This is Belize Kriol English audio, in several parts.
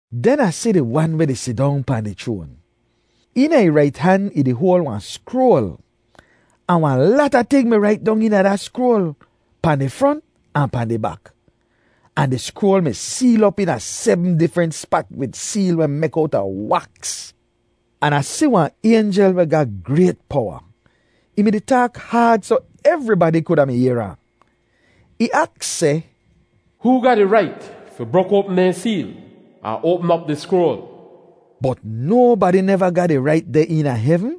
Den Ah si di Wan weh di sidong pahn di chroan. Eena ih rait han ih di hoal wahn skroal. Ahn wahn lata ting mi rait dong eena da skroal, pahn di front ahn pahn di bak. Ahn di skroal mi seel op eena sebm difrent spat wid seel weh mek owta waks. An Ah si wahn aynjel weh ga grayt powa. Ih mi-di taak haad soh evribadi kuda mi yehr ahn. Ih aks seh, “Hoo ga di rait fi brok oapm dehn seel ahn oapm op di skroal?” Bot nobadi neva ga di rait deh eena hevn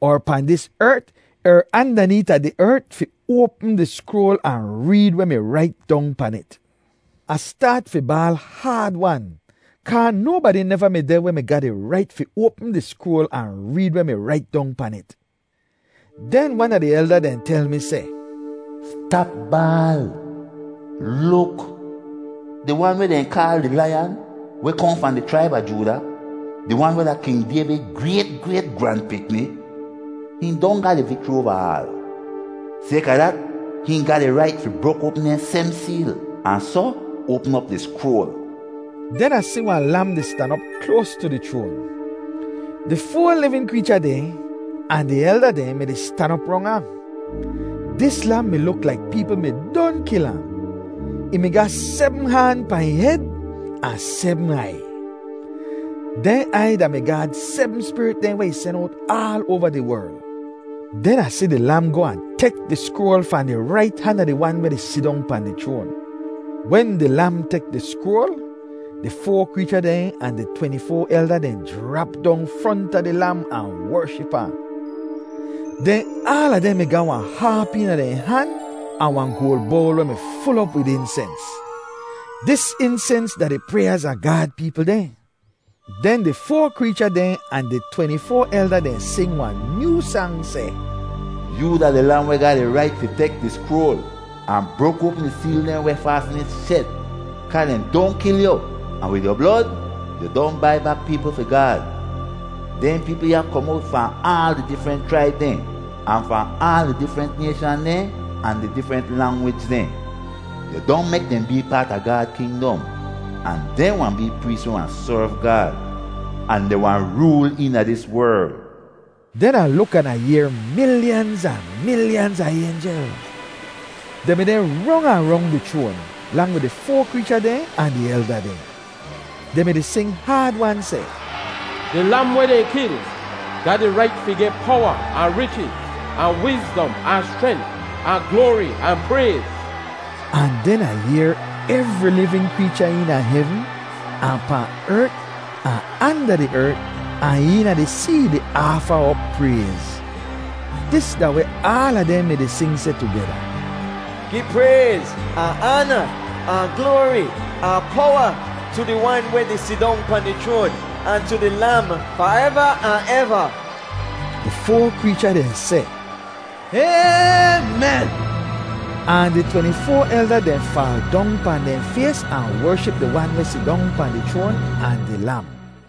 er pahn dis ert er andaneeta di ert fi oapm di skroal ahn reed weh mi rait dong pan it. Ah staat fi baal haad-wan kaa nobadi neva mi deh weh mi ga di rait fi oapm di skroal ahn reed weh mi rait dong pan it. Den wan a di elda dehn tel mi seh, “Stap baal. Luk! Di Wan weh dehn kaal di Laiyan weh kohn fahn di chraib a Jooda, di Wan weh da King Dayvid grayt grayt gran-pikni, hihn don ga di vikchri oava aal. Sayka dat, hihn ga di rait fi brok oapm dehn sebm seel ahn soh oapm op di skroal.” Den Ah si wahn Lam di stan op kloas tu di chroan. Di foa livin kreecha dehn ahn di elda dehn mi-di stan op rong ahn. Dis Lam mi luk laik peepl mi don kil ahn. Ih mi ga sebm haan pahn ih hed ahn sebm aiy. Dehn aiy da-mi Gaad sebm Spirit dehn weh ih sen owt aal oava di werl. Den Ah si di Lam goh ahn tek di skroal fahn di rait han a di Wan weh di sidong pahn di chroan. Wen di Lam tek di skroal, di foa kreecha dehn ahn di tweni-foa elda dehn jrap dong fronta di Lam ahn wership ahn. Den aala dehn mi ga wahn haap eena dehn han ahn wahn goal bowl, weh mi ful op wid insens. Dis insens da di pryaaz a Gaad peepl dehn. Den di foa kreecha dehn ahn di tweni-foa elda dehn sing wahn nyoo sang, seh, “Yoo da di Lam weh ga di rait fi tek di skroal ahn brok oapm di seel dehn weh faasn it shet. Kaa dehn don kil yu, ahn wid yu blod yu don bai bak peepl fi Gaad. Dehn peepl ya kom owt fahn aal di difrent chraib dehn, ahn fahn aal di difrent nayshan dehn, ahn di difrent langwij dehn. Yu don mek dehn bee paat a Gaad kingdom, ahn dehn wahn bee prees weh wahn serv Gaad, ahn dehn wahn rool eena dis werl.” Den Ah luk an Ah yehr milyanz ahn milyanz a aynjel. Dehn mi deh rong ahn rong di chroan, lang wid di foa kreecha dehn ahn di elda dehn. Dehn mi-di sing haad-wan seh, “Di Lam weh dehn kil ga di rait fi geh powa ahn richiz, ahn wizdom ahn schrent, ahn gloari ahn prayz!” Ahn den Ah yehr evri livin kreecha eena hevn ahn pahn ert ahn anda di ert ahn eena di see di aafa op prayz. Dis da weh aala dehn mi-di sing seh tugeda: “Gi prayz ahn aana ahn gloari ahn powa tu di Wan weh di sidong pahn di chroan, ahn tu di Lam fareva ahn eva!” Di foa kreecha dehn seh, “Aymen!” Ahn di tweni-foa elda dehn faal dong pahn dehn fays ahn wership di Wan weh sidong pahn di chroan ahn di Lam.